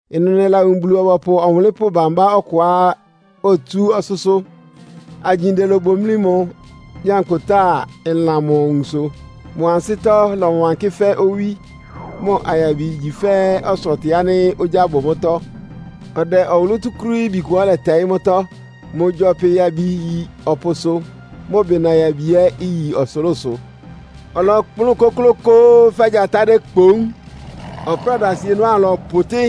Ɩnʋ nɛlawun Bulu-ɔbɔpʋ ɔwʋnlɩ́npʋ́ bambá ɔkʋá otsú ɔsʋ́sʋ́. Agyinde lobomlí mʋ, nyankpʋtáa ɩlan mʋ awunso. Mʋ ansɩ́tɔ́ lɔwankɩ́ fɛ́ owí, mʋ ayabi igyi fɛ́ ɔsɔtɩ ánɩ́ ogyá bʋ mʋ́tɔ́. Ɔdɛ ɔwʋlʋ́ túkúrííbi kʋá ɔlɛtɛɩ́ mʋ́tɔ́. Mʋ gyɔpɩ yabi iyi ɔpʋsʋ, mʋ bɩna yabi ɛ́ iyi ɔsʋlʋ́sʋ. Ɔlɔkplʋ́n kʋ́klʋ́kʋ́ʋ́ fɛ́ gyatá dékpoún, ɔpráda asienɔ́ ámʋ lɔpʋtɩ́.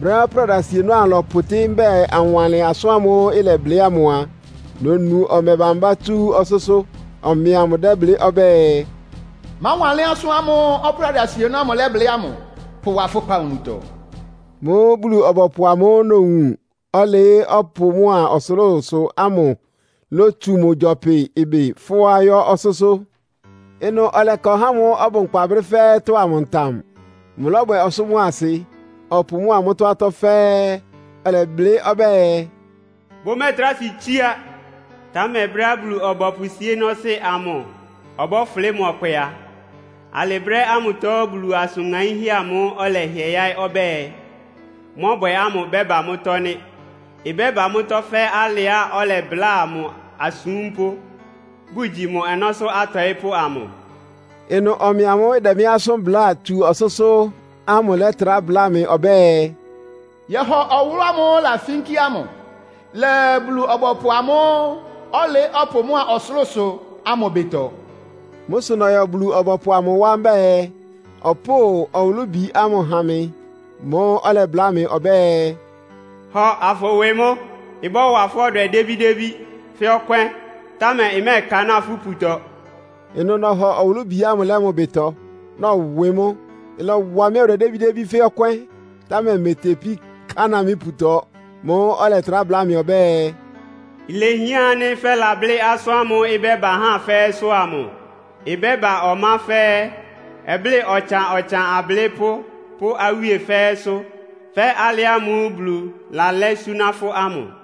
Brɛ́á ɔpráda asienɔ́ ámʋ lɔpʋtɩ́, mbɛ́ɛ anwanlɩn asʋ́n ámʋ́ʋ́ ɩlɛblɩ́ ámʋ a, nonu ɔmɛ bámbá tsú ɔsʋ́sʋ́. Ɔmɛ amʋ dɛ́blɩ́ ɔbɛ́ɛ, “Máwanlɩ́n asʋ́n ámʋ́ʋ́ ɔpráda asienɔ́ ámʋ ɩlablɩ́ ámʋ. Pʋwa fʋ́ kpawunutɔ.” Mʋ́ʋ́ Bulu-ɔbɔpʋ amʋ́ʋ́ nowun, ɔlɩɩ́ ɔpʋ mʋ́a ɔsʋlʋ́sʋ ámʋ lótsu mʋ gyɔpɩ ɩbɩ fʋ́á yɔ́ ɔsʋ́sʋ́. Ɩnʋ ɔlɛka ɔhá ámʋ́ʋ́ ɔbʋ nkpa brɛ́ fɛ́ɛ́tɔ́ ámʋ ntam. Mʋlɔ́bwɛ ɔsʋ́ mʋ́a asɩ, ɔpʋ mʋ́a mʋ́tɔ́ atɔ́ fɛ́ɛ́, ɔlɛblɩ́ ɔbɛ́ɛ, “Bʋmɛ́ɛtrá si tsiá! Támɛ brɛ́á Bulu-ɔbɔpʋ síénɔ́sɩ́ amʋ ɔbɔ́fʋlɩ́ mʋ ɔkpɛ a, alɩ brɛ́ ámʋtɔ Bulu asʋn ŋaínhɛ́ amʋ́ʋ́ ɔlɛhɩɛ yáɩ́ ɔbɛ́ɛ, mɔ́bwɛ ámʋ ɩbɛ́ba mʋ́tɔ́ nɩ́. Ɩbɛ́ba mʋ́tɔ́ fɛ́ alɩá ɔlɛbláa mʋ asúmpʋ́, bʋgyi mʋ ɔnɔ́sʋ́ atɔɩ́pʋ́ amʋ.” Ɩnʋ ɔmɛ amʋ́ʋ́ ɩdɛ mɩ́ asʋ́n bláa tsú ɔsʋ́sʋ́ ámʋ lɛ́trá bláa mɩ ɔbɛ́ɛ, “Yɔhɔ ɔwʋlʋ́ ámʋ́ʋ́ ɩlafínkí ámʋ lɛ Bulu-ɔbɔpʋ amʋ́ʋ́ ɔlɩɩ́ ɔpʋ mʋ́a ɔsʋlʋ́sʋ ámʋ ɩbɩtɔ.” Mʋ́ sʋ nɔyɔ Bulu-ɔbɔpʋ amʋ wá mbɛ́ɛ, ɔpʋ́ʋ ɔwʋlʋ́bi ámʋ ha mɩ. Mʋ́ʋ́ ɔlɛbláa mɩ ɔbɛ́ɛ, “Hɔ, afʋwɩ mʋ́! Ɩbɔ́wa fʋ́ ɔdwɛ débídébí fɛ́ ɔkwɛ́n, támɛ ɩmɛ́ɛkanáa fʋ́ iputɔ.” Ɩnʋ nɔhɔ ɔwʋlʋ́bi ámʋ lɛ́ mʋ ɩbɩtɔ, nɔwɩ mʋ́. Ɩlɔwa mɩ́ ɔdwɛ débídébí fɛ́ ɔkwɛ́n, támɛ imetepí kanáa mɩ́ iputɔ. Mʋ́ʋ́ ɔlɛtrá bláa mɩ ɔbɛ́ɛ, “Ilehián ánɩ́ fɛ́lablɩ́ asʋ́n ámʋ́ʋ́ ɩbɛ́ba ahá fɛ́ɛ́sʋ́ ámʋ. Ɩbɛ́ba ɔmá fɛ́ɛ́, ɔblɩ́ɩ ɔtsan-ɔtsan ablɩ́pʋ́ pʋ́ awíe fɛ́ɛ́sʋ́, fɛ́ alɩ ámʋ́ʋ́ Bulu lalɛ́ súná fʋ́ ámʋ!”